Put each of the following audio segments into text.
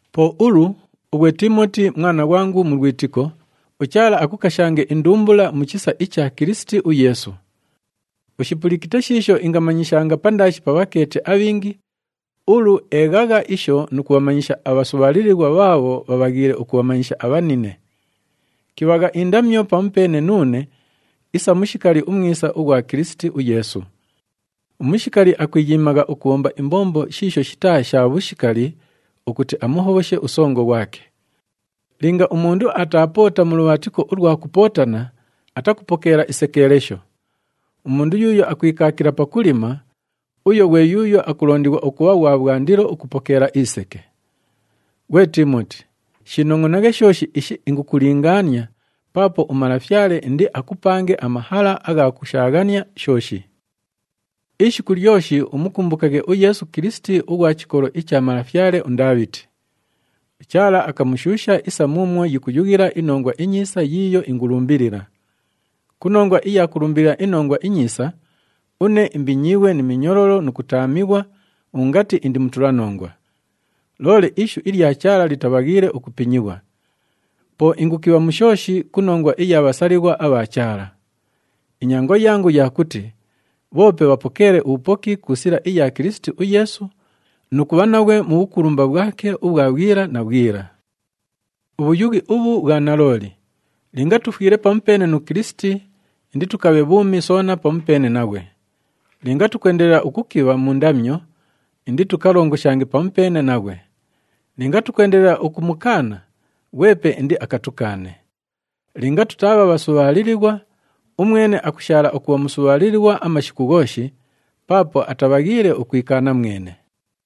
Po ulu, ughwe Tiimoti mwana ghwangu mu lwitiko, uChaala akukashange indumbula mu chisa icha Kilisiti uYeesu. Ushipulikite shiisho ingamanyishanga pandaashi pa bhakeeti abhingi, ulu eeghagha isho nu kubhamanyisha abhasubhaalilighwa bhaabho bhabhaghiile ukubhamanyisha abhanine. Kibhagha indamyo pamupeene nuune isa umushikali umwisa ughwa Kilisiti uYeesu. Umushikali akwiyiimagha ukubhomba imbombo shiisho shitaa sha bhushikali ukuti amuhobhoshe usongo ghwake. Linga umundu ataapoota mu lubhaatiko ulwa kupootana, atakupokeela isekeelesho. Umundu yuuyo akwikaakila pakulima, uyo ghwe yuuyo akulondighwa ukubha ghwa bhwandilo ukupokeela iseke. Ghwe Tiimoti, shiinongʼonaghe shooshi ishi ingukulingaania paapo uMalafyale indiakupange amahala agha kushaaghania shooshi. Ishiku lyoshi umukumbukaghe uYeesu Kilisiti ughwa chikolo icha malafyale uNdaabhiti. UChaala akamushuusha isa muumwo yikuyughila iNongwa iNyiisa yiiyo ingulumbilila. Ku nongwa iya kulumbilila iNongwa iNyiisa, une imbinyiighwe ni minyololo nu kutaamighwa ungati indi mutulanongwa. Loole ishu ilya Chaala litabhaghiile ukupinyighwa. Po ingukibha mu shooshi ku nongwa iya bhasalighwa abha Chaala. Inyango yangu ya kuti bhoope bhapokeelaghe ubhupoki ku sila iya Kilisiti uYeesu nu kubha naghwe mu bhukulumba bhwake ubhwa bhwila na bhwila. Ubhuyughi ubhu bhwa nalooli, “Linga tufwile pamupeene nu Kilisiti, inditukabhe bhuumi soona pamupeene naghwe. Linga tukwendelela ukukibha mu ndamyo, inditukalongoshange pamupeene naghwe. Linga tukwendelela ukumukaana, ghwepe indiakatukaane. Linga tutaabha bhasubhaalilighwa, umwene akushaala ukubha musubhaalilighwa amashiku ghooshi, paapo atabhaghiile ukwikaana mwene.”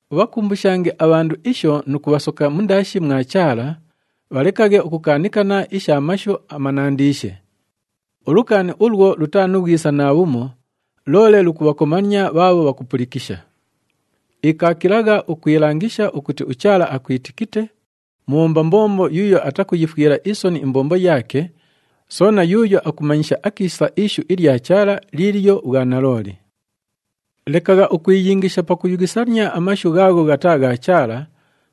Ubhakumbushange abhandu isho nu kubhasoka mundaashi mwa Chaala, bhalekaghe ukukaanikana isha mashu amanandiishe. Ulukaani ulwo lutaa nu bhwisa naabhumo, loole lukubhakomania bhaabho bhakupulikisha. Ikaakilagha ukwilangisha ukuti uChaala akwitikite, mubhomba mbombo yuuyo atakuyifwila isoni imbombo yaake, soona yuuyo akumanyisha akiisa ishu ilya Chaala liilyo bhwanalooli. Lekagha ukwiyingisha pakuyughisania amashu ghaagho ghataa gha Chaala,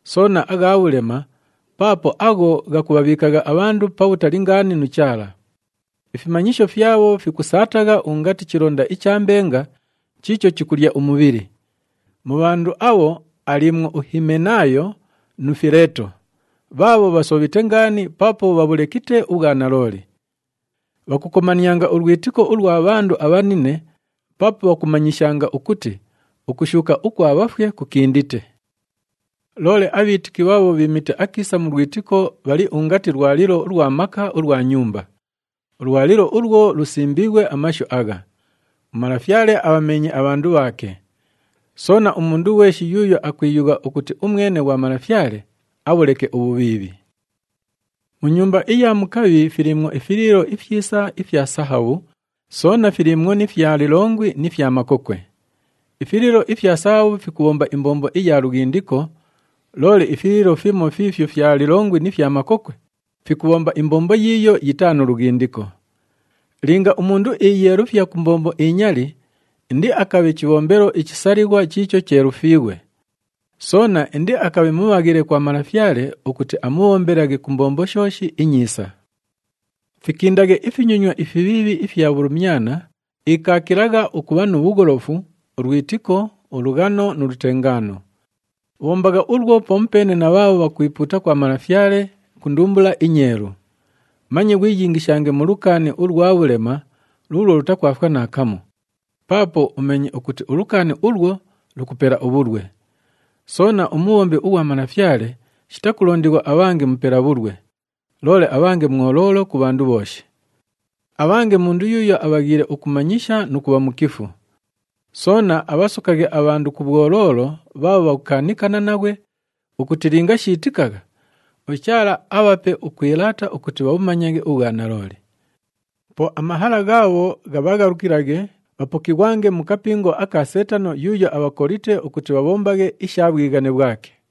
soona agha bhulema, paapo agho ghakubhabhiikagha abhandu pabhutali ngaani nu Chaala. Ifimanyisho fyabho fikusaatagha ungati chilonda icha mbenga chiicho chikulya umubhili. Mu bhandu abho aliimwo uHimenaayo nu Fileeto, bhaabho bhasobhite ngaani paapo bhabhulekite ubhwanalooli. Bhakukomanianga ulwitiko ulwa bhandu abhanine paapo bhakumanyishanga ukuti ukushuuka ukwa bhafwe kukindite. Loole abhiitiki bhaabho bhiimite akiisa mu lwitiko bhali ungati lwalilo ulwa maka ulwa nyumba. Ulwalilo ulwo lusimbiighwe amashu agha, “UMalafyale abhameenye abhandu bhaake.” Soona, “Umundu ghweshi yuuyo akwiyugha ukuti umwene ghwa Malafyale, abhuleke ubhubhiibhi.” Mu nyumba iya mukabhi filiimwo ifiliilo ifyisa ifya sahabhu, soona filiimwo ni fya lilongwi ni fya makokwe. Ifiliilo ifya sahabhu fikubhomba imbombo iya lughindiko, loole ifiliilo fimo fiifyo fya lilongwi ni fya makokwe fikubhomba imbombo yiiyo yitaa nu lughindiko. Linga umundu iiyeelufya ku mbombo inyali, indiakabhe chibhombelo ichisalighwa chiicho cheelufiighwe. Soona indiakabhe mubhaghile kwa Malafyale ukuti amubhombelaghe ku mbombo shooshi inyiisa. Fikindaghe ifinyonywa ifibhiibhi ifya bhulumyana, ikaakilagha ukubha nu bhugholofu, ulwitiko, ulughano nu lutengaano. Bhombagha ulwo pamupeene na bhaabho bhakwipuuta kwa Malafyale ku ndumbula inyeelu. Manye ghwiyingishange mu lukaani ulwa bhulema luulwo lutakwafwa naakamu, paapo umeenye ukuti ulukaani ulwo lukupela ubhulwe. Soona, umubhombi ughwa Malafyale shitakulondighwa abhange mupela bhulwe, loole abhange mwoloolo ku bhandu bhooshi. Abhange mundu yuuyo abhaghiile ukumanyisha nu kubha mukifu. Soona abhasokaghe abhandu ku bhwoloolo bhaabho bhakukaanikana naghwe ukuti linga shiitikagha, uChaala abhape ukwilaata ukuti bhabhumanyaghe ubhwanalooli. Po amahala ghaabho ghabhaghalukilaghe, bhapokighwange mu kapingo aka Seetano yuuyo abhakolite ukuti bhabhombaghe isha bhwighane bhwake.